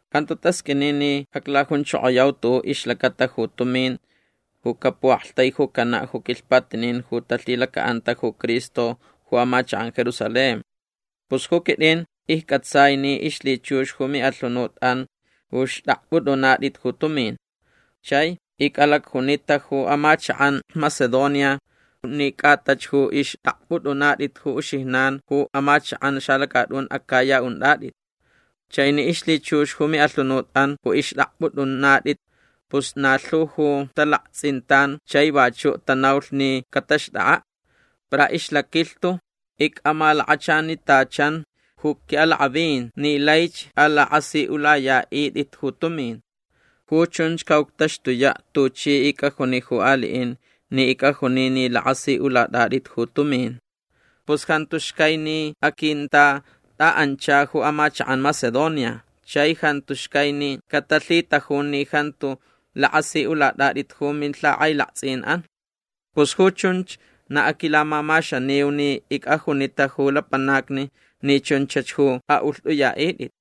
Jantu tasqʼuini ni aclajunchokoyau tuʼuʼ ixlacata ju tumin ju capuʼaktaijucanaʼ ju quilhpatinin ju talhilacaʼanta ju Cristo ju amachakʼan Jerusalén. Pus ju quitʼin iccʼatsai ni ixlhichux ju miʼalhunutʼan ju xtʼakpʼutʼunatʼit ju tumin. Chai icʼalacjunita ju amachakʼan Macedonia ni cʼatach ju ixtʼakpʼutʼunatʼit ju uxijnan ju amachakʼan xalacatʼun Acaya untʼatʼit. Chai ni ixlhichux ju miʼalhunutʼan ju ixtʼakpʼutʼunatʼit pus na lhu ju talaktsʼintan chai vachuʼ tanaulh ni cataxtʼakʼaʼ. Para ixlaquilhtu icʼamalakachanitachan ju quiʼalakʼavin ni laich alakʼasiʼulayaʼitʼit ju tumin. Ju chunch caʼuctaxtuyaʼ tuchi icʼajuni ju aliʼin ni icʼajuni ni lakʼasiʼulatʼatʼit ju tumin. Pus jantu xcai ni aquintatʼaʼancha ju amachakʼan Macedonia. Chai jantu xcai ni catalhitajun ni jantu lakʼasiʼulatʼatʼit ju milhakʼailaktsʼinʼan. Pus ju chunch na aquilamamaxaniu ni icʼajunita ju lapanacni ni chunchach ju aʼulhtʼuyaʼitʼit.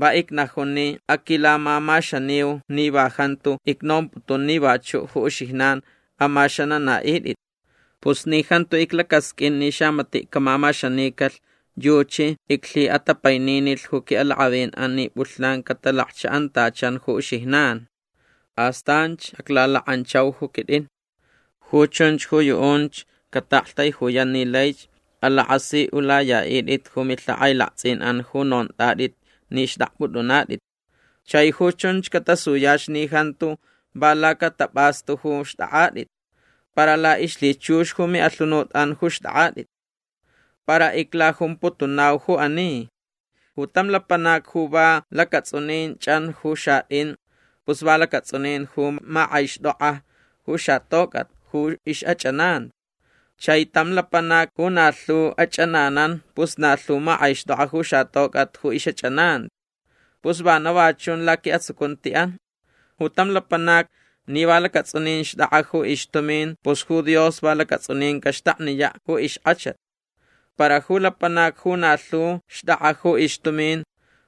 Va icnajun ni aquilamamaxaniu ni va jantu icnomputun ni vachuʼ ju uxijnan amaxananaʼitʼit. Pus ni jantu iclacasqʼuin ni xamatiʼ camamaxanicalh yuchi iclhiʼatapaininilh ju quiʼalakʼavinʼan ni pʼulhnan catalakchaʼantachan ju uxijnan. Astanch aclalakʼanchau ju quitʼin. Ju chunch ju yuʼunch cataʼaktaijuyan ni laich alakʼasiʼulayaʼitʼit ju milhakʼailaktsʼinʼan ju nontʼatʼit ni xtʼakpʼutʼunatʼit. Chai ju chunch catasuyach ni jantu va lacatapʼastu ju xtʼakʼatʼit. Para laʼixlhichux ju miʼalhunutʼan ju xtʼakʼatʼit. Para iclajumputunau ju ani. Ju tam lapanac ju va lacatsʼunin chʼan ju xatʼin pus va lacatsʼunin ju makʼaixtʼokʼa ju xatocʼat ju ixʼachʼananti. Chai tam lapanac ju na lhu achʼananan pus na lhu makʼaixtʼokʼa ju xatocʼat ju ixʼachʼananti. Pus vana va chun laquiʼatsucuntiʼan. Ju tam lapanac ni va lacatsʼunin xtʼakʼa ju ixtumin pus ju Dios va lacatsʼunin caxtakniyaʼ ju ixkʼachat. Para ju lapanac ju na lhu xtʼakʼa ju ixtumin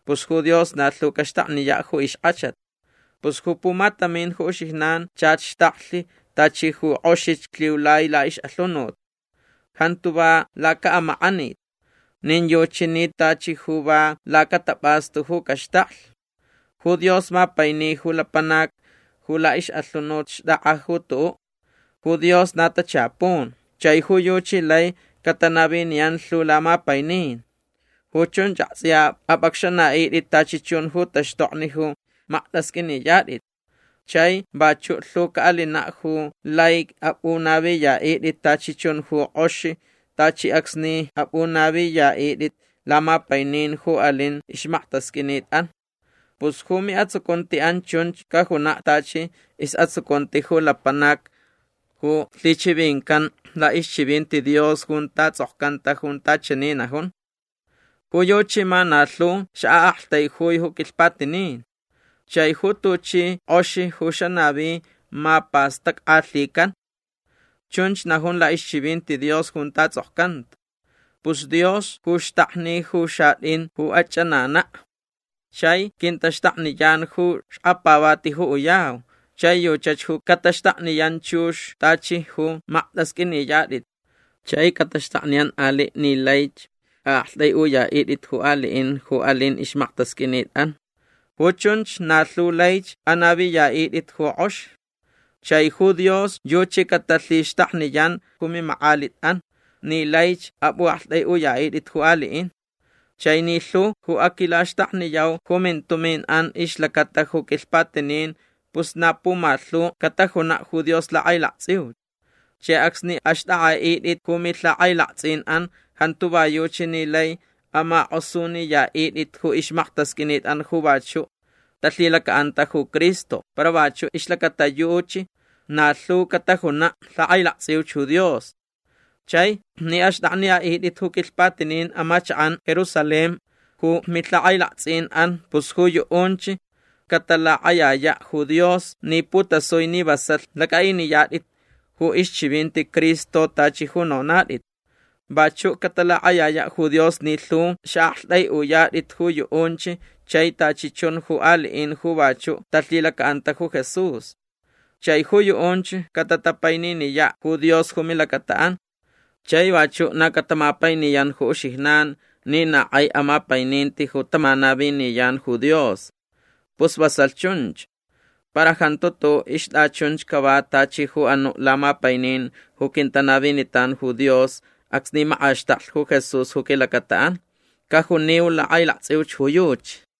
pus ju Dios na lhu caxtakniyaʼ ju ixkʼachat. Pus ju pumatamin ju uxijnan chach xtaklh tachi ju kʼoxich lhiulai laʼixʼalhunut. Jantu va lacaʼamakʼanit. Nin yuchi ni tachi ju va lacatapʼastu ju caxtaklh. Ju Dios mapaini ju lapanac ju laʼixʼalhunut xtʼakʼa ju tuʼuʼ. Ju Dios na tachapun. Chai ju yuchi lai catanaviniyan lhu lamapainin. Ju chunch aktsʼiya apʼacxanaʼitʼit tachi chun ju taxtokni ju maktasqʼuiniyatʼit. Chai vachuʼ lhu caʼalinaʼ ju lai apʼunaviyaʼitʼit tachi chun ju kʼox tachi acsni apʼunaviniyaʼitʼit lamapainin ju alin ixmaktasqʼuinitʼan. Pus ju miʼatsucuntiʼan chunch cajunaʼ tachi isʼatsucunti ju lapanac ju lhichivincanta laʼixchivinti Dios junta tsʼokcanta junta chani najun: Ju yuchi ma na lhu xaʼaʼaktaijui ju quilhpatinin. Chai ju tuchi kʼox ju xanavi ma pastackʼalhican. Chunch najun laʼixchivinti Dios junta tsʼokcanta. Pus Dios ju xtakni ju xatʼin ju achʼananaʼ. Chai quintaxtakniyan ju xkapavati ju uyau. Chai yuchach ju cataxtakniyan chux tachi ju maktasqʼuiniyatʼit chai cataxtakniyan aliʼ ni laich aʼaktʼaiʼuyaʼitʼit ju aliʼin ju alin ixmaktasqʼuinitʼan. Ju chunch na lhu laich anaviyaʼitʼit ju kʼox. Chai ju Dios yuchi catalhixtakniyan ju mimakʼalitʼan ni laich apʼuʼaktʼaiʼuyaʼitʼit ju aliʼin. Chai ni lhu ju aquilaxtakniyau ju mintuminʼan ixlacata ju quilhpatinin pus na pumalhu catajunaʼ ju Dios lakʼailaktsʼiuch. Chai acsni axtʼakʼaʼitʼit ju milhakʼailaktsʼinʼan jantu va yuchi ni lai amakʼosuniyaʼitʼit ju ixmaktasqʼuinitʼan ju vachuʼ talhilacaʼanta ju Cristo para vachuʼ ixlacata yuchi na lhu catajunaʼ lakʼailaktsʼiuch ju Dios. Chai ni axtʼakniyaʼitʼit ju quilhpatinin amachakʼan Jerusalén ju milhakʼailaktsʼinʼan pus ju yuʼunch catalakʼayayaʼ ju Dios ni putasui ni vasalh lacʼaʼiniyatʼit ju ixchivinti Cristo tachi ju nonatʼit. Vachuʼ catalakʼayayaʼ ju Dios ni lhu xaʼaktʼaiʼuyatʼit ju yuʼunch chai tachi chun ju aliʼin ju vachuʼ talhilacaʼanta ju Jesús. Chai ju yuʼunch catatapaininiyaʼ ju Dios ju milacataʼan. Chai vachuʼ na catamapainiyan ju uxijnan ni na kʼai amapaininti ju tamanaviniyan ju Dios. Pus vasalh chunch. Para jantu tuʼuʼ ixtʼachunch cava tachi ju anuʼ lamapainin ju quintanavinitan ju Dios acsni makʼaxtaklh ju Jesús ju quilacataʼan. Cajuniu lakʼailaktsʼiuch ju yuchi.